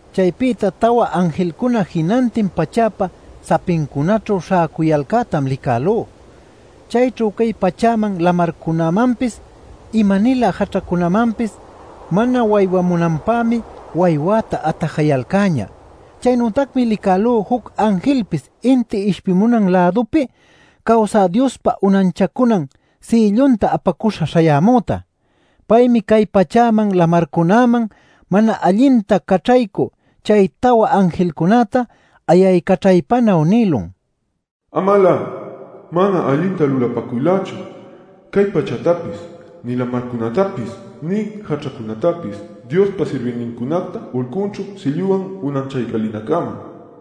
Chaypïta tawa anjilcuna jinantin pachäpa sapincunaćhu śhäcuyalcätam licälú. Chayćhu cay pachäman, lamarcunämanpis, ima-nilä jaćhacunamanpis mana waywamunanpämi waywäta atajayalcäñä. Chaynütacmi licälú juc anjilpis inti ishpimunan lädupi cawsä Diospa unanchacunan sïllunta apacuśha śhayämüta. Paymi cay pachäman, lamarcunäman mana allinta caćhaycü chay tawa anjilcunäta ayaycaćhaypanuy nïlun: “Amalä mana allinta lulapäcuylächu cay pachätapis, nï lamarcunätapis, nï jaćhacunätapis Diospa sirbïnincunacta ulcunćhu sïlluwan unanchaycälinäcama” nil.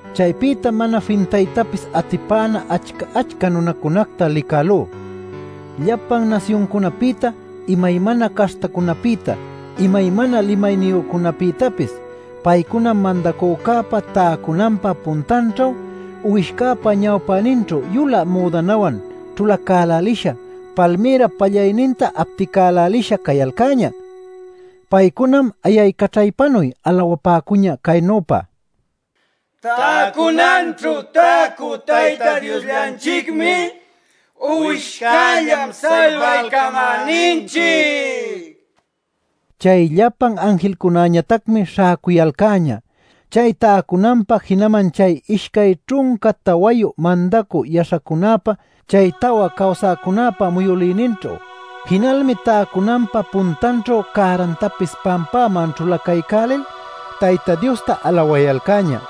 Chaypïtam mana fintaytapis atipäna achca-achca nunacunacta licälú: llapan nasyuncunapïta, imaymana caśhtacunapïta, imaymana limayniyücunapïtapis. Paycunam mandacücäpa täcunanpa puntanćhu, Uwishcäpa ñawpäninćhu yulä müdanawan ćhulacälälisha palmïrap pallayninta apticälälisha cayalcäñä. Paycunam ayaycaćhaypanuy alawapäcuñä caynüpa: “Täcunanćhu täcü Tayta Diosllanchicmi, Uwishcällam salbaycamäninchic” nil. Chay llapan anjilcunäñatacmi śhäcuyalcäñä chay täcunanpa, jinaman chay ishcay ćhunca tawayu mandacü yaśhacunäpa, chay tawa cawsäcunäpa muyülïninćhu. Jinalmi täcunanpa puntanćhu cärantapis pampäman ćhulacaycälil Tayta Diosta alawayalcäñä: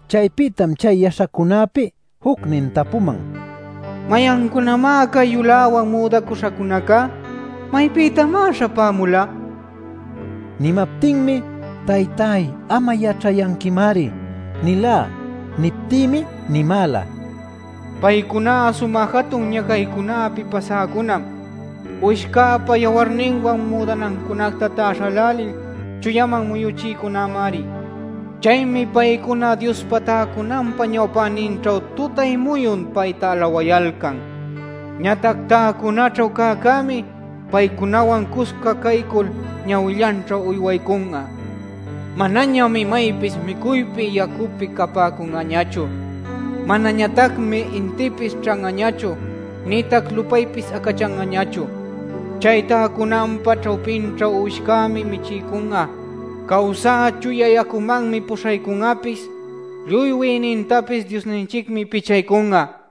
Chaypïtam chay yaśhacunäpi jucnin tapuman: “¿Mayancunamá cay yuläwan müdacuśhacunaca? ¿Maypïtamá śhapämula?” nil. Nimaptinmi: “Taytay, am'a yaćhayanquimari” nilá. Niptïmi nimäla: “Paycuná sumä jatun ñacaycunäpi pasäcunam. Uwishcäpa yawarninwan müdanancunacta täśhälälil chuyaman muyuchïcunamari. Chaymi paycuna Diospa täcunanpa ñawpäninćhu tutay-muyun payta alawayalcan. Ñatac täcunaćhu cäcämi paycunawan cusca caycul ñawillanćhu uywaycun'a. Manañam imaypis micuypi yacupi capäcun'añachu. Manañatacmi intïpis ćhan'añachu nïtac lupaypis acachan'añachu. Chay täcunanpa ćhawpinćhu uwishcämi michiycun'a; cawsä chuya yacumanmi puśhaycun'apis; lluy wïnintapis Diosninchicmi pichaycun'a” nil.